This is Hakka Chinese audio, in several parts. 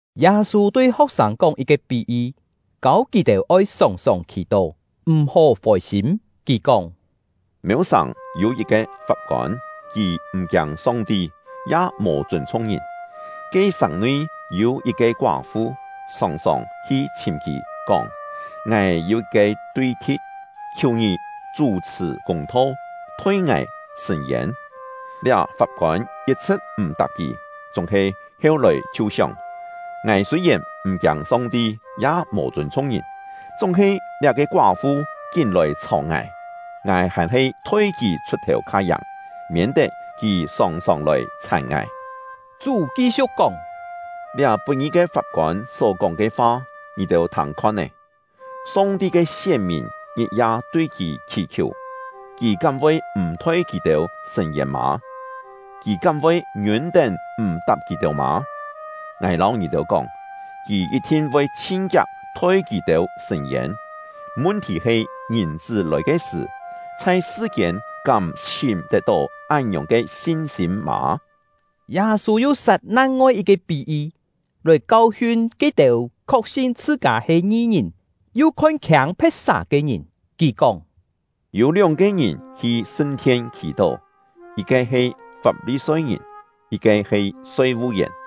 Yâ-sû tui ho̍k-sâng kóng yit-ke pí-yi, kâu kì-têu oi sòng-sòng khì-tó, m̀-hó fôi-sîm. Kì kóng: “Mêu-sàng yû yit-ke fap-kôn, kì m̀ kiâng Song-ti, ya mò chûn-chhung ngìn. Ke sàng-nui yû yit-ke koá-fu, sòng-sòng hi chhìm kì, kóng: ‘Ngài yû yit-ke tui-thi̍t, khiù ngì chú-chhṳ̀ kûng-tho, thoi ngài sṳ̂n-yên.’ Liá fap-kôn yit-chhṳ̍t m̀-tap kì, chúng-he heu-lòi chhiu sióng: ‘Ngài sûi-yèn m̀ kiâng Song-ti, ya mò chûn-chhung ngìn, chúng-he liá-ke koá-fu kín-lòi chhàu ngài, ngài hàn-he thoi kì chhut-thèu kha-yàng, miên-tet kì sòng-sòng lòi chhàn ngài!’” Chú ki-siu̍k kóng: “Liá put-ngi ke fap-kôn só-kóng ke fa, ngì-têu thâng khon-é! Song-ti ke sién-mìn ngit-ya tui Kì khì-khiù, Kì kám voi m̀ thoi kì-têu sṳ̂n-yên mâ? Kì kám voi ngiûn-tén m̀-tap kì-têu mâ? Ngài lâu ngì-têu kóng, Kì yit-thin voi chhin-kiak thoi kì-têu sṳ̂n-yên. Mun-thì he Ngìn-chṳ́ lòi ke sṳ̀, chhai sṳ-kiên kám chhìm tet-tó án-ngiòng ke sin-sîm mâ?” Yâ-sû yu sat nang-ngoi yit-ke pí-yi, lòi kau-hiun ke-têu khok-sin chhṳ-kâ he ngi-ngìn yu khon-khiâng phe̍t-sà ke ngìn. Kì kóng: “Yû lióng-ke ngìn hi sṳn-thien khì-tó: Yit-ke he Fap-li-soi-ngìn, yit-ke he soi-vu-yèn.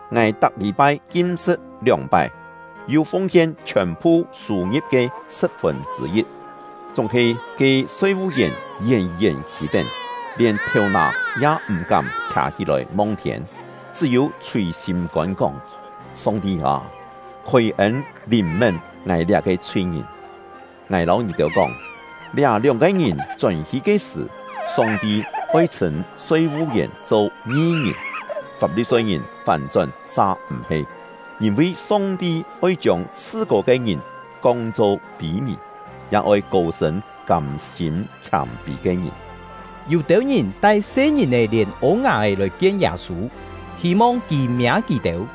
Ngài tak lî-pai kim-sṳ̍t lióng-pái, yu fung-hien chhiòn-phu sû-ngi̍p ke sṳ̍p-fûn chṳ̂-yit.’ Chúng-he ke soi-vu-yèn yén-yén khî-tén, lièn thèu-nà ya m̀-kám khià-hí-lòi mong-thiên, chṳ́-yû chhùi sîm-kôn kóng: ‘Song-ti â, khôi-ên lìn-mén ngài liá-ke chhui-ngìn!’ Ngài lâu ngì-têu kóng, liá lióng-ke ngìn chón-hi ke sṳ̀, Song-ti oi chhṳ̂n soi-vu-yèn cho ngi-ngìn, Fap-li-soi-ngìn fán-chón sa m̀-he. Yîn-vi Song-ti oi chiông chhṳ-kô ke ngìn kong-cho pî-mì, ya oi kô-sṳ̂n kâm-sîm khiâm-pî ke ngìn.” Yû-têu ngìn tai se-ngìn-è lièn ô-nga-é lòi-kien Yâ-sû, hî-mong kì miâ kì-têu.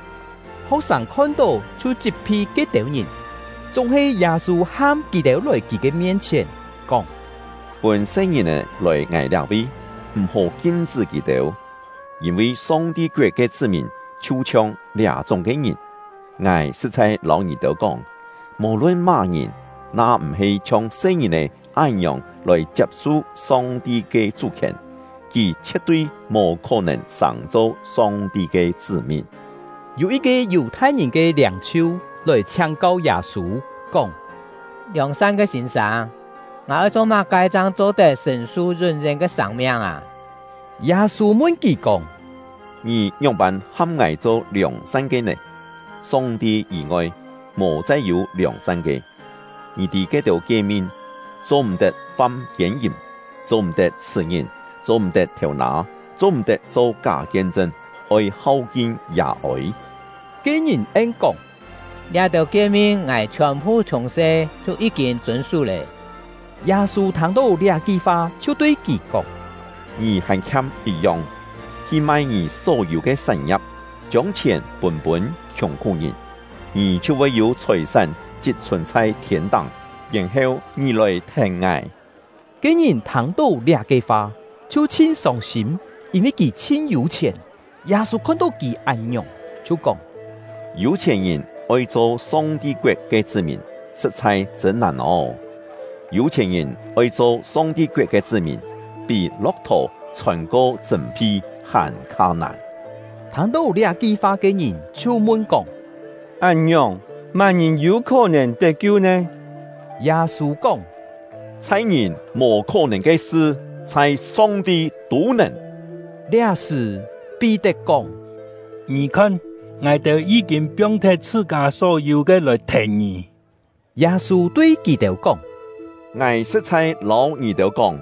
Ho̍k-sâng khon-tó chhiu chit-phi ke-têu ngìn. Chúng-he Yâ-sû ham kì-têu lòi kì ke mien-chhièn, kóng: “Pûn se-ngìn-è lòi ngài liá-vi, m̀-hó kim-chṳ́ kì-têu, yîn-vi Song-ti koet ke chṳ́-mìn chhiu-chhiong liá-chúng ke ngìn. Ngài sṳ̍t-chhai lâu ngì-têu kóng, mò-lun má-ngìn, na m̀-he chhiong se-ngìn-è án-ngiòng lòi chiap-su Song-ti ke chú-khièn, kì chhie̍t-tui mò khó-nèn sàng-cho Song-ti ke chṳ́-mìn.” Yû yit-ke Yù-thai-ngìn ke liâng-chhiu lòi chhiáng-kau Yâ-sû, kóng: “Liòng-san ke sîn-sâng, ngài oi cho má-ke chang cho-tet sṳ̀n-su yún-yén ke sâng-miang â?” Yâ-sû mun kì kóng: “Ngì ngióng-pân ham ngài cho liòng-san ke nè? Song-ti yî-ngoi, mò chai yû liòng-san ke. Ngì tî ke-têu kie-min: ‘Cho-m̀-tet fam kiên-yìm; cho-m̀-tet chhṳ̀-ngìn; cho-m̀-tet thêu-nâ; cho-m̀-tet cho ká kien-chṳn; oi hau-kin yà-ôi.’” Ke ngìn en-kóng: “Liá-têu kie-min ngài chhiòn-phu chhiùng-se chhiu yí-kîn chûn-sú lé.” Yâ-sû thâng-tó liá-ki fa, chhiu tui kì kóng: “Ngì hàn khiam yit-yong. Hi mai ngì só-yû ke sán-ngia̍p, chiông chhièn pûn-pûn khiùng-khú-ngìn, ngì chhiu voi yû chhòi-sán chit-chhùn chhai thiên-táng; yèn-heu ngì lòi thèn ngài.” Ke ngìn thâng-tó liá-ke fa, chhiu chhin sông-sîm, yîn-vi kì chhin yû-chhièn. Yâ-sû khon-tó kì án-ngiòng, chhiu kóng: “Yû-chhièn-ngìn oi cho Song-ti koet ke chṳ́-mìn, sṳ̍t-chhai chṳ̂n nàn ô! Yû-chhièn-ngìn oi cho Song-ti koet ke chṳ́-mìn, pí lo̍k-thò chhôn-ko chṳ̂m-phi hàn-kha nàn!” Thâng-tó liá-ki fa ke ngìn chhiu mun-kóng: “Án-ngiòng, má-ngìn yû khó-nèn tet-kiu nè?” Yâ-sû kóng: “Chhai ngìn mò khó-nèn ke sṳ, chhai Song-ti tû nèn.” Liá-sṳ̀, Pí-tet kóng: “Ngì khon, ngài-têu yí-kîn piong-thet chhṳ-kâ só-yû ke lòi thèn ngì.” Yâ-sû tui kì-têu kóng: “Ngài sṳ̍t-chhai lâu ngì-têu kóng,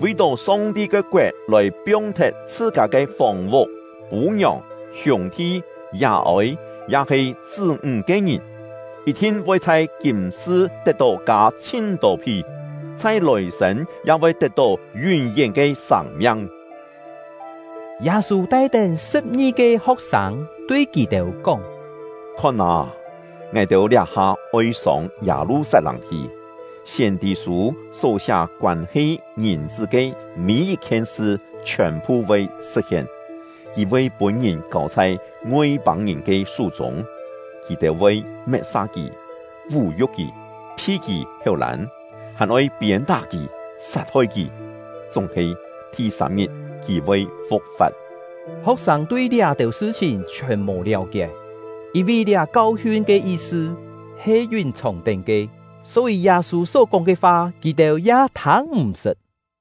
vi-tó Song-ti ke koet lòi piong-thet chhṳ-kâ ke fòng-vuk, pû-ngiòng, hiûng-thi, yà-ôi, ya-he chṳ́-ńg ke ngìn, yit-thin voi chhai kîm-sṳ tet-tó kâ chhin-tô phi, chhai lòi-sên ya voi tet-tó yún-yén ke sâng-miang.” Yâ-sû tai-tén sṳ̍p-ngi-ke ho̍k-sâng, tui kì-têu kóng: “Khon â, ngài-têu liá-ha oi sông Yâ-lu-sat-lâng hi; siên-tî-sû só siá koân-he Ngìn-chṳ́ ke mî-yit-khien sṳ chhiòn-phu voi sṳ̍t-hien. Kì voi pûn-ngìn kâu chhai Ngoi-pâng-ngìn ke sú-chûng; kì-têu voi met-sa kì, vú-yu̍k kì, phi kì héu-lân, hàn-oi piên-tá kì, sat-hoi kì; chúng-he, thi-sâm-ngit kì voi fu̍k-fa̍t.” Ho̍k-sâng tui liá-têu sṳ-chhìn chhiòn mò liáu-kié, yîn-vi liá kau-hiun ke yi-sṳ he yún-chhòng-tén ke; só-yî Yâ-sû só kóng ke fa kì-têu ya thâng-m̀-sṳt.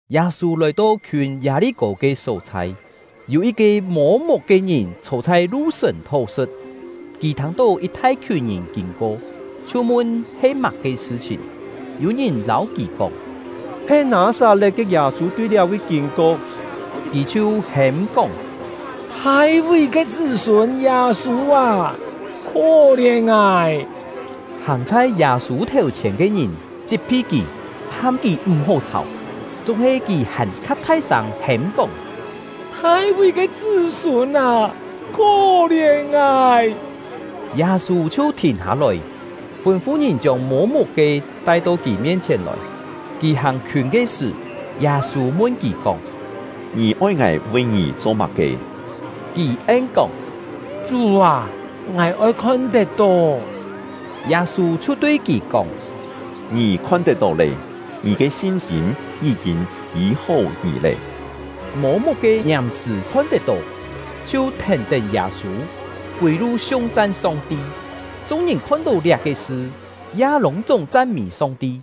Yâ-sû lòi-to khiûn Yâ-li-kô ke só-chhai, yû yit-ke mô-muk ke ngìn chhô chhai lu-sùn thó-sṳ̍t. Kì thâng-tó yit thai-khiùn ngìn kîn-ko, chhiu mun he má-ke sṳ-chhìn. Yû ngìn lâu kì kóng: “He Nâ-sat-le̍t ke Yâ-sû tui liá-vi kîn-ko.” Kì chhiu hêm-kóng: “Thai-ví ke chṳ́-sûn Yâ-sû â, khó-lièn ngài!” Hàng chhai Yâ-sû thèu-chhièn ke ngìn chit-phi kì, ham kì m̀-hó chhàu. Chúng-he kì hàn-kha thai-sâng hêm-kóng: “Thai-ví ke chṳ́-sûn â, khó-lièn ngài!” Yâ-sû chhiu thìn hâ-lòi, fûn-fu ngìn chiông mô-muk-ke tai-to kì mien-chhièn lòi. Kì hàng-khiûn ke sṳ̀, Yâ-sû mun kì kóng: “Ngì oi ngài vi ngì cho má-ke?” Kì en-kóng: “Chú â, ngài oi khon-tet-tó!” Yâ-sû chhiu tui kì kóng: “Ngì khon-tet-tó lé! Ngì ke sin-sîm yí-kîn yî-hó ngì lé.” Mô-muk-ke ngiàm-sṳ̀ khon-tet-tó, chhiu thèn-tén Yâ-sû, kûi-lu siung-chan Song-ti. Chung-ngìn khon-tó liá-ke sṳ, ya lûng-chúng chan-mî Song-ti.